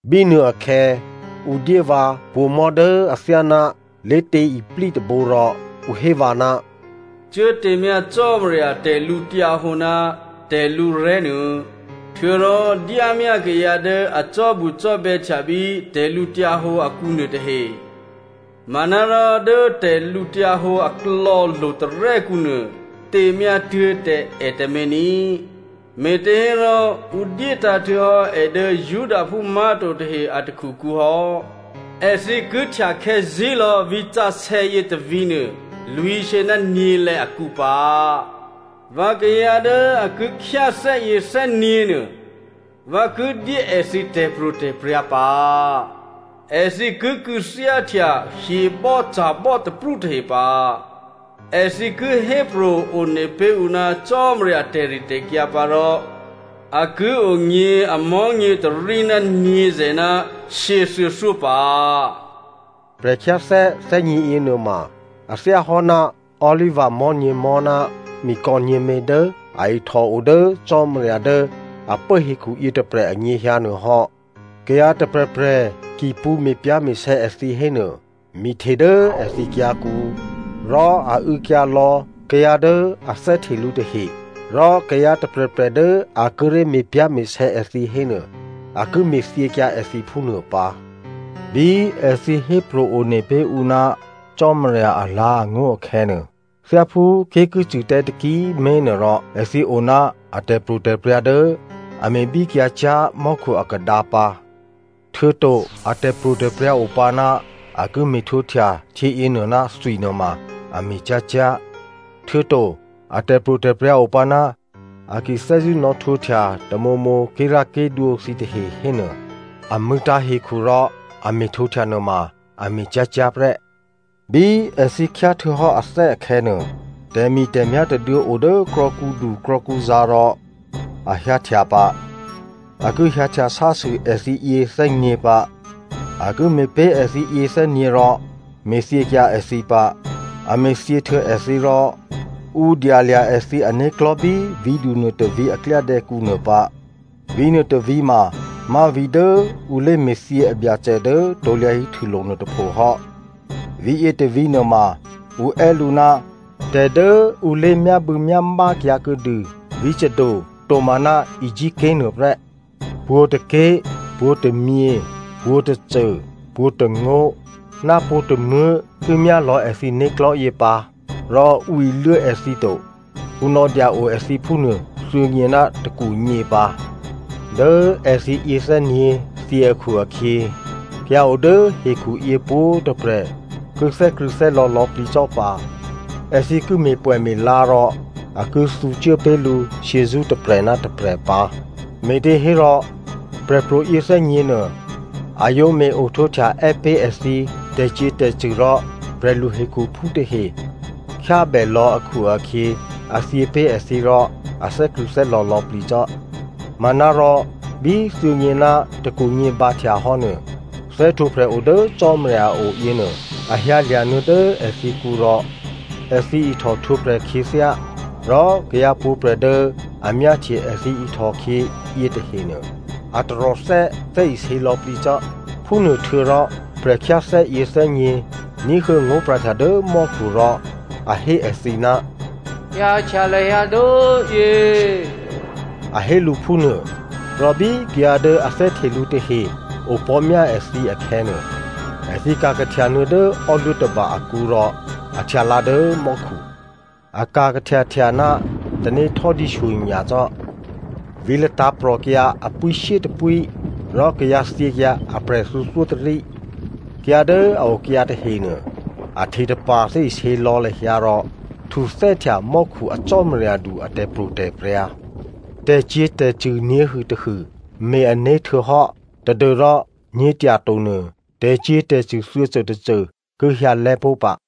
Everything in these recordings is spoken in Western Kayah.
Bínuôakhè̌ ǔ dyé vǎ pǒ̤mò̤́ dố athyáná lé̤tě iplí tôbǒ rò ǔ hé vǎ, “Cuốtěmyá Cò́marya tè̤lǔhǒdu ná tè̤lǔrè̤́ nuô, htuô̌rò dyámyá kayǎ dố a cò́bucò́bè̌htya bí tè̤lǔhǒdu akǔnuô tahe. Manárò dố tè̤lǔhǒdu aklò̌ lo̤tarè́kǔ nuô těmyá tuố̤ tǎ è tǎmé̤ ní꤮, me̤těhérò ǔ dyétǎ̤ htuô̌hò́ è dố Judaphú má̤to tahe a takhukǔ hò́. Èthǐ ki htyakhè̌ zí̤lò̌ vǐ̤sǎsè̌ yětôvǐ̤ nuô lwǐ̤shyě ná nyě̤lè̌ akǔ pǎ. Vǎ kayǎ dố a ki khyáthè́yě thè́nyě̤ nuô, vǎ ki dyé èthǐ tè̤pro̤tè̤prya̤ pǎ. Èthǐ ki kû̌thyáhtya hyebò́ca̤bò́ taprú tahe pǎ. Èthǐ ki hépro̤ one pé̤ ǔ ná Cò́marya tè̤ritè̤kyǎ pǎ rò a ki onyě̤ amò̤́nyě tôrí ná nyě̤zè̤ ná shyěthuô̌thyó pǎ.” Prè̤khyáthè́ thè́nyě̤yě nuôma a thyáhò́ ná olivamò̤́ nyě̤mò̤́ ná mikò̌ nyě̤mě dố a ihtòo dố Cò́marya dố a pố hekhu yětôprè̤ anyěhyǎ nuô hò́. Kayǎ tôprè̤prè̤ ki pṳ̌ me̤pyá̤me̤sè̌ èthǐ hénuô mi hte dố èthǐ kyǎ̤kǔ, rò a û̌kyǎ lò̌ kayǎ dố a thè́hte lǔ tahe. Rò kayǎ tôprè̤prè̤ dố a kíré̤ me̤pyá̤me̤sè̌ èthǐ hénuô a ki me̤thyěkyǎ èthǐ phúnuô pǎ. Bí èthǐ hépro̤ one pé̤ ǔ ná Cò́marya alǎ̤angó̤ akhè̌nuô, thyáphú ké̤ ki cṳ̂ tǎ taki꤮ mé̤ nuôrò, èthǐ o ná a tè̤pro̤tè̤prya̤ dố a me̤bíkyǎcyá̤ mò́khu akadǎ pǎ. Htuô̌to a tè̤pro̤tè̤prya̤ opǎ ná a ki me̤htwǒhtya htyěyěnuô ná thwi nuôma a me̤ cyá̤cyá̤. Htuô̌to a tè̤pro̤tè̤prya̤ opǎ ná a ki thè́zṳ̂́ nò̌htwǒhtya tamǒmǒ ké̤rá̤ké̤dwǒ thǐtahe hénuô, a mṳ̂̌tǎ̤ hekhu rò a me̤htwǒhtya nuôma, a me̤ cyá̤cyá̤ prè́. Bí èthǐ khyáhtuô̌hò́ athè́ akhè̌nuô, tè̤mi̤tè̤myá̤ tôduô̌ o dố krò̌kǔdu krò̌kǔzǎ̤ rò a hyǎhtya pǎ. A ki hyǎhtya sásû èthǐ yěthè́nyě̤ pǎ. A ki me̤pé̤ èthǐ yěthè́nyě̤ rò me̤thyěkyǎ èthǐ pǎ. A me̤thyě htuô̌ èthǐ rò ǔ dyalya̤ èthǐ ané̤klò̤́ bí vǐ̤du nuôtôvǐ̤ a klyádè̌kǔ nuô pǎ. Vǐ̤nuô tôvǐ̤ mamá̤ vǐ̤ dố ǔ lé̤me̤thyě a Byacè dố krusulo̤ nuôtôpho hò́. Vǐ̤yě tôvǐ̤ nuôma ǔ è́ lǔ ná tè̤ dố ǔ lé̤myábû̌myámá kyǎ kuô̌dû vǐ̤ Sodom tomaná Egypt ké̤ nuô prè́. Pwǒ̤tôké̤, pwǒ̤tômyě, pwǒ̤tôcô, pwǒ̤tôngó̤, ná pwǒ̤tômuố̤ ki myálò̌ èthǐ né̤klò̤́yě pǎ rò ǔ iluố èthǐ to. Ǔ nò̌dya-o èthǐ phúnuô thuô̌nyě ná tôkwonyě pǎ. Dố èthǐ yěthè́nyě̤ thyě akhu-akhyě, kayǎ o dố hekhuyě pwǒ̤꤮ tôprè̤ ki thè́krṳ̂̌thè́lò̌ lò̌plǐ cò́ pǎ. Èthǐ ki me̤pwè̌me̤la rò a ki thǔcuố pé̤ lǔ shyězṳ́ tôprè̤ ná tôprè̤ pǎ, me̤těhérò prè̤pro̤ yěthè́nyě̤ nuô a yǒ me̤-ohtwǒhtya è́ pé̤ èthǐ tè̤cyě̤tè̤cṳ̂ rò prè̤lu hekhuphú tahe khyábèlò̌ akhu-akhyě, a thyě pé̤ èthǐ rò a thè́krṳ̂̌thè́lò̌ lò̌plǐ cò́. Manárò bí thuô̌nyě ná tôkwonyě bǎhtyahò́ nuô, thè́htwǒprè̤ o dố Cò́marya a o yěnuô, a hyǎlya̤ nuô̌ dố èthǐkǔ rò èthǐ ihtòhtwǒprè̤ khyěthyá. Rò kayǎ pwǒ̤꤮ prè̤ dố a myáhtye èthǐ ihtòkhyě yětahenuô, a taròthè́ thè́isě lò̌plǐ cò́. Phúnuôhtuô̌rò prè̤khyáthè́ yěthè́nyě̤ ní̤huô̌ ngó̤pra̤htya dố mò́khu rò a hé èthǐ, “Hyǎhtya lahyǎ dốyě” a hé lǔ phúnuô. Rò bí kayǎ dố a thè́hte lǔ tahe opò̤́myá èthǐ akhè̌nuô, èthǐ ka̤kahtya nuô̌ dố ò́luố̤ tôba akǔ rò a htyalǎ dố mò́khu. A ka̤ kahtyahtya ná tanéhtò́dǐ shyonyacò́. Vǐ̤ latǎ̤prò̤kyǎ a pwíshyétôpwí rò kayǎthyěkyǎ aprè̤ thuô̌thyótôrí. Kayǎ dố a okyǎ tahenuô, a htetapa̤ thè́isě lò̌ lahyǎ rò htuthè́htya mò́khu a Cò́maryadu a tè̤pro̤tè̤prya̤. Tè̤cyě̤tè̤cṳ̂ nyě̤hûtôhû me̤-ané̤ htuô̌hò́ tadû́rò nyě̤tyato nuô tè̤cyě̤tè̤cṳ̂ thuô̌côtôcô ki hyǎlè́ pó̤ pǎ.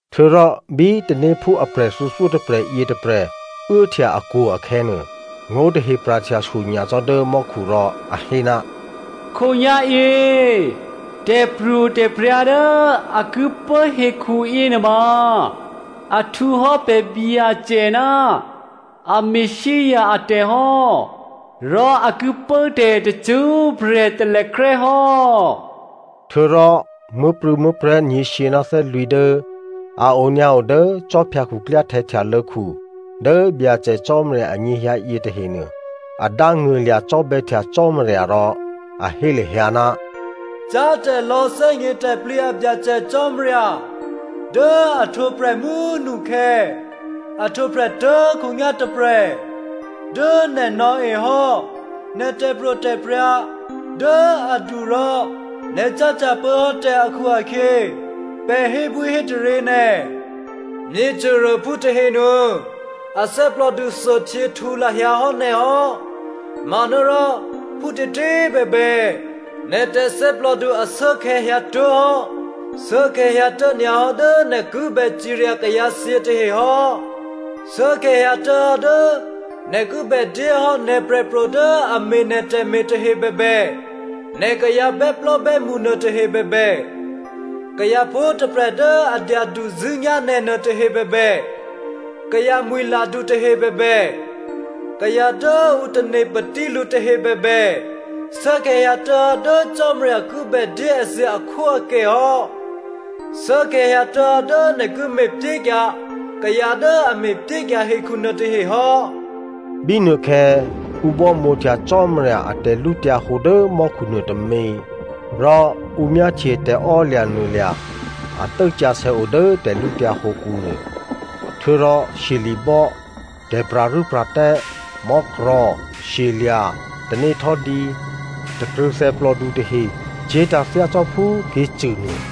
Htuô̌rò bí tanéphú aprè̤ thuô̌thyótôprè̤ yětôprè̤ uốhtya akwo̤ akhè̌nuô, ngó̤tahe pra̤htya shyonyacò́ dố mò́khu rò a hé, “Khǒnyá̤yě tè̤pro̤tè̤prya̤ dố a ki pố hekhu yěnuôma a htwǒhò́ pè̤ Byacè ná a Messia atè̤ hò́ rò a ki pốtè̤ tacṳ́prè̤ talèkrè́ hò́.” Htuô̌rò muố̤prû̌muố̤prè̤́ nyě̤shyě ná thè́lwǐ̤ dố a onyǎo dố khwí khuklyáhtè̌ htyalô̌khu dố Byacè Cò́marya anyěhyǎ yětahenuô, a dángṳ̂lya̤ cò́bè̌htya Cò́marya rò a hé lahyǎ, “Cyá̤tè̤lò̌ thè́gnětè̤plǐ a Byacè Cò́marya dố a ohtwǒprè̤ mú꤮ nukhè̌, a ohtwǒprè̤ tuố̤khǒnyá̤ tôprè̤꤮, dố nè̤ nò̌ehò́ nè̤ tè̤pro̤tè̤prya̤ dố adu rò nè̤ cáhtya pốhò́tè̤ akhu-akhyě pè̤ hébwíhétaryě nè̤. Myěcôruôphú tahenuô, a thè́plòdu thuôhtyěhtǔ lahyǎ hò́ nè̤ hò́. Manárò, phútětě꤮ bèbè, nè̤ tè̤thè́plòdu ashuốkhè̌ hyǎtuố̤hò́. Shuốkhè̌ hyǎtuố̤ nyǎ hò́ dố nè̤ kibè cirya kayǎthyě tahe hò́. Shuốkhè̌ hyǎtuố̤hò́ dố nè̤ kibè dyé hò́ nè̤ prè̤pro̤ dố a me̤ nè̤ tè̤me̤ tahe bèbè, nè̤ kayǎ bè́plò́bè́mṳ nuôtahe bèbè, kayǎ pwǒ̤꤮ tôprè̤ dố a dyaduzṳ̂́nyá̤ nè̤ nuôtahe bèbè, kayǎ mwi̤ladu tahe bèbè, kayǎ dố ǔ tane̤ patí lǔ tahe bèbè shuốkhè̌ hyǎtuố̤hò́ dố Cò́marya ki bèdyé èthǐ akhwóakè hò́. Shuốkhè̌ hyǎtuố̤hò́ dố nè̤ ki me̤pyékyǎ kayǎ dố a me̤pyékyǎ hekhu nuôtahe hò́.” Bínuôkhè̌ ǔ bámǒhtya Cò́marya a tè̤lǔhǒdu dố mò́khu nuôtômě. Rò ǔ myáhtye tè̤emaklò̤ a tốsǎsè̌ o dố tè̤lǔtyǎ hǒkǔ nuô. Htuô̌rò shyeli̤bò́, tè̤pra̤rû́pra̤tè́, mò́krò̤̌ shyelya̤, tanéhtò́dǐ, takrṳ̂thè plòdu tahe cye̤tǎ̤ thyácò́phú ké̤cṳ̂ nuô.